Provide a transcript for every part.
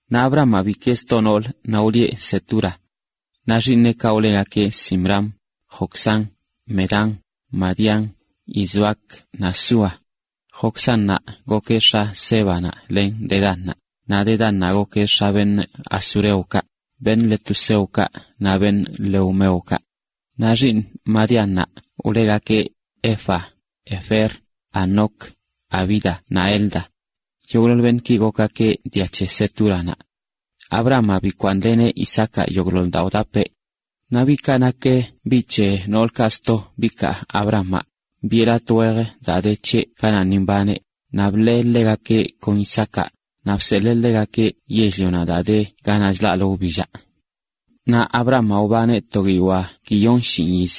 Abrahamaꞌ bikee sto noolə, naꞌ wlieꞌ Cetura. Naꞌ xiiṉeꞌkaꞌ wlegakeꞌ Zimram, Joksán, Medán, Madián, Isbac naꞌ Súa. Joksánnaꞌ gokeꞌ x̱a Sébanaꞌ len Dedánnaꞌ, naꞌ Dedánnaꞌ gokeꞌ x̱a asureokaꞌ, letuseokaꞌ naꞌ leumeokaꞌ. Naꞌ xiiṉ Madiánnaꞌ wlegakeꞌ Efa, Efer, Hanoc, Abida naꞌ Elda. Yogꞌḻoḻ beṉꞌki gokgakeꞌ dia c̱he Cetúranaꞌ. Abrahamaꞌ bikwaaṉleneꞌ Isaacaꞌ yogꞌḻoḻ daa wdapeꞌ. Naꞌ biꞌkaꞌ nak biꞌ c̱he noolkaꞌ sto bikaa Abrahamaꞌ, biꞌe latꞌ wejə daa de c̱heꞌ kanaꞌ ni mbaneꞌ, naꞌ bḻee ḻegakeꞌ kon Isaacaꞌ, naꞌ bseḻee ḻegakeꞌ yell-lionaꞌ daa de ganaꞌ chlaꞌlə wbillaꞌ. Naꞌ Abrahamaꞌ wbaneꞌ to guiyoa guiyon shinꞌ yiz.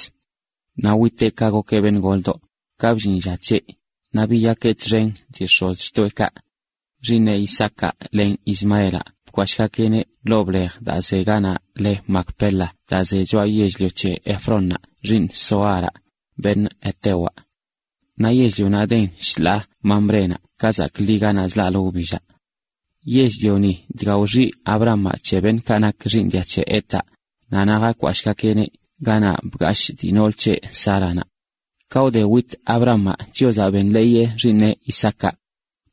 Naꞌ witeꞌ ka gokeꞌ beṉꞌ goldoꞌ, ka bllin lla c̱heꞌ, naꞌ biyakeꞌ txen dii x̱ozxtoꞌekaꞌ. Xiiṉeꞌ Isaacaꞌ len Ismaelaꞌ bkwashꞌgakeꞌneꞌ ḻoo blej daa ze ganaꞌ le Macpela daa ze choꞌa yell-lio c̱he Efrónnaꞌ xiiṉ Zoharaꞌ, beṉꞌ hetewaꞌ. Naꞌ yell-lionaꞌ den shḻaa Mamrénaꞌ ka zaakli ganaꞌ chlaꞌlə wbillaꞌ. Yell-lioni dga wxiꞌ Abrahamaꞌ c̱he beṉꞌkaꞌ nak xiiṉ dia c̱he Hetaꞌ, naꞌ naꞌ jakwashꞌgakeꞌneꞌ ganaꞌ bgashꞌ dii nool c̱heꞌ, Sáranaꞌ. Ka wde wit Abrahamaꞌ, Chiozaꞌ benḻeeyeꞌ xiiṉeꞌ Isaacaꞌ.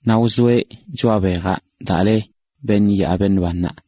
Naꞌ wzoeꞌ choꞌa bejaꞌ daa le “Beṉꞌ yaa beṉꞌ bannaꞌ,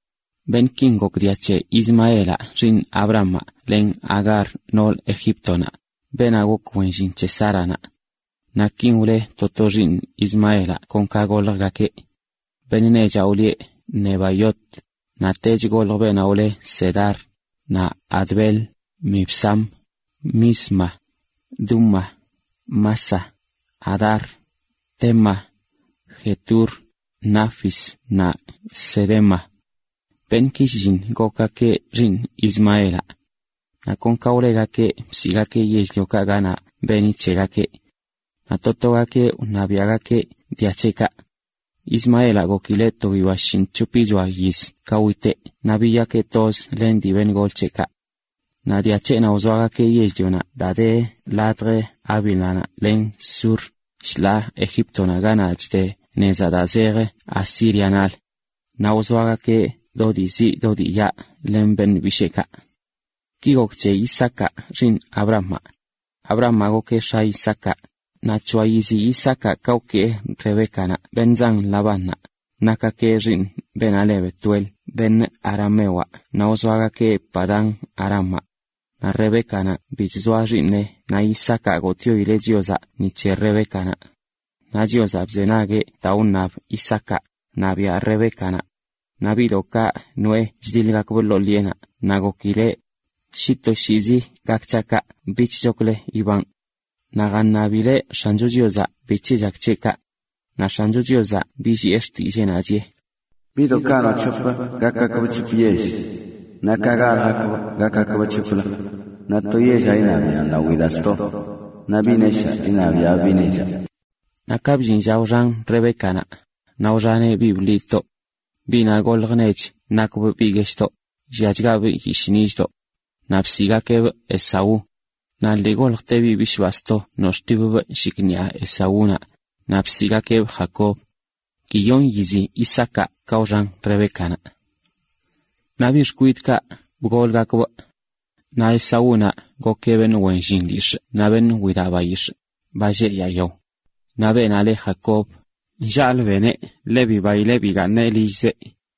Beṉꞌkin gok dia c̱he Ismaelaꞌ xiiṉ Abrahamaꞌ len Agar nool Egíptonaꞌ, beenaꞌ gok wen llin c̱he Sáranaꞌ. Naꞌ kin wle to to xiiṉ Ismaelaꞌ kon ka goljgakeꞌ: beṉꞌ nechaꞌ wlieꞌ Nebaiot, naꞌ tech goljə beenaꞌ wle Cedar, naꞌ Adbeel, Mibsam, Misma, Duma, Massa, Hadar, Tema, Jetur, Nafis naꞌ Cedema. Beṉꞌki shlliṉ gokgakeꞌ xiiṉ Ismaelaꞌ. Naꞌ kon ka wlegakeꞌ bsiꞌgakeꞌ yell-liokaꞌ ganaꞌ beni c̱hegakeꞌ. Naꞌ to togakeꞌ wṉabiꞌagakeꞌ dia c̱heꞌkaꞌ. Ismaelaꞌ gokileꞌ to guiyoa shinꞌc̱hopichoa yiz ka witeꞌ naꞌ biyakeꞌ toz len dii beṉꞌ gol c̱heꞌkaꞌ. Naꞌ dia c̱heꞌnaꞌ wzoagakeꞌ yell-lionaꞌ daa de ladj Havila len Sur, shḻaa Egíptonaꞌ ganaꞌ chde nezaꞌ daa zej Asírianaꞌlə. Naꞌ wzoagakeꞌ do dii ziꞌ do dii yaꞌ len beṉꞌ bisheekaꞌ. Ki gok c̱he Isaacaꞌ xiiṉ Abrahamaꞌ: Abrahamaꞌ gokeꞌ x̱a Isaacaꞌ, naꞌ c̱hoa yizi Isaacaꞌ ka wkee Rebécanaꞌ beṉꞌ zan Labánnaꞌ, beṉꞌkaꞌ nak xiiṉ beenaꞌ le Betuel, aramewaꞌ, beṉꞌkaꞌ wzoa Padán-arámaꞌ. Naꞌ Rebécanaꞌ bi chzoa xiiṉeꞌ naꞌ Isaacaꞌ gotꞌyoileꞌ Chiozaꞌ ni c̱he Rebécanaꞌ. Naꞌ Chiozaꞌ bzenagueꞌ daa wṉab Isaacaꞌ, naꞌ biaꞌ Rebécanaꞌ. Naꞌ biꞌdoꞌkaꞌ noꞌe chdiḻgakbꞌ ḻoo ḻiꞌenaꞌ naꞌ gokileꞌ, “Shi toshiizi gak c̱haꞌ kaꞌ, bichchoklə ibanꞌ.” Naꞌ jaṉabileꞌ X̱ancho Chiozaꞌ bic̱he chak c̱heꞌ kaꞌ. Naꞌ X̱ancho Chiozaꞌ billiꞌe xtilleenaꞌ, chiꞌe: “Biꞌdoꞌkaꞌ noo c̱hop gakgakbꞌ c̱hop yell. Naꞌ ka galjgakbꞌ gakgakbꞌ c̱hoplə. Naꞌ to yellaꞌ iṉabiaꞌn lawi daa sto. Naꞌ biꞌ neshaa iṉabiaꞌbꞌ biꞌ nechaꞌ.” Naꞌ ka bllin lla wxan Rebécanaꞌ, naꞌ wxaneꞌ biꞌ bḻidꞌdoꞌ. Biꞌnaꞌ goljə nech nakbꞌ biꞌ gueshꞌdoꞌ, lliachgabꞌ yishꞌ nillꞌdoꞌ. Naꞌ bsiꞌgakeꞌbꞌ Esaú. Naꞌ lii goljte biꞌ bishꞌbaa sto nox̱ꞌtipbꞌ shikṉiꞌa Esaúnaꞌ, naꞌ bsiꞌgakeꞌbꞌ Jacob. Guiyon yizi Isaacaꞌ ka wxan Rebécanaꞌ. Naꞌ biꞌ xkwidꞌkaꞌ bgolgakbꞌ. Naꞌ Esaúnaꞌ gokeꞌ beṉꞌ wen llin lyix̱ꞌ naꞌ beṉꞌ widaꞌ bayix̱ꞌ, ba lleꞌ yaa yao. Naꞌ beenaꞌ le Jacob, nllaalə beneꞌ, ḻe bibaileꞌ bigaaṉeꞌ lillzeꞌ.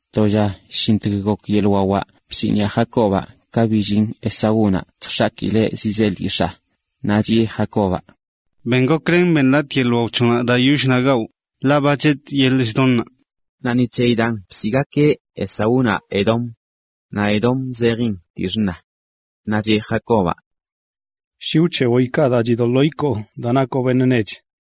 To lla shintg gok yeḻ wawaꞌ bsiniꞌa Jacobaꞌ ka billin Esaúnaꞌ chjx̱akileꞌ zizee lyix̱aa. Naꞌ chiꞌe Jacobaꞌ: ―Ben goklen beṉ latꞌ yeḻꞌ wao c̱hoꞌnaꞌ daa yoll xṉa gawꞌ, ḻaꞌ ba chetꞌ yeḻꞌ chdonnaꞌ. (Naꞌ ni c̱heyi daan bsiꞌgakeꞌ Esaúnaꞌ Edom. Naꞌ Edom zejin: dii xṉa.) Naꞌ cheꞌ Jacobaꞌ: ―Shi wc̱heboꞌ ikaa daa chidoḻoo ikoo daa nakoꞌ beṉꞌ nech.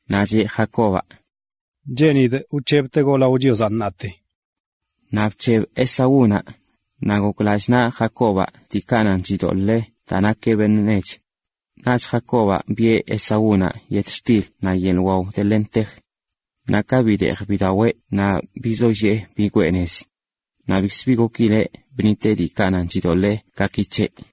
Naꞌ cheꞌ Jacobaꞌ: ―Cheenidꞌ wc̱hebtegoꞌ lao Chiozaꞌ ṉaate. Naꞌ bc̱heb Esaúnaꞌ, naꞌ gok lallꞌ naꞌ Jacobaꞌ diikaꞌ nan chidoḻee daa nakeꞌ beṉꞌ nech. Naꞌch Jacobaꞌ biꞌe Esaúnaꞌ yetxtil naꞌ yeḻꞌ wao de lentej. Naꞌ ka bideej bidaweꞌ naꞌ bizollee bigwee nez. Naꞌ bikzə bi gokileꞌ bṉiteꞌ diikaꞌ nan chidoḻee gaki c̱heꞌ.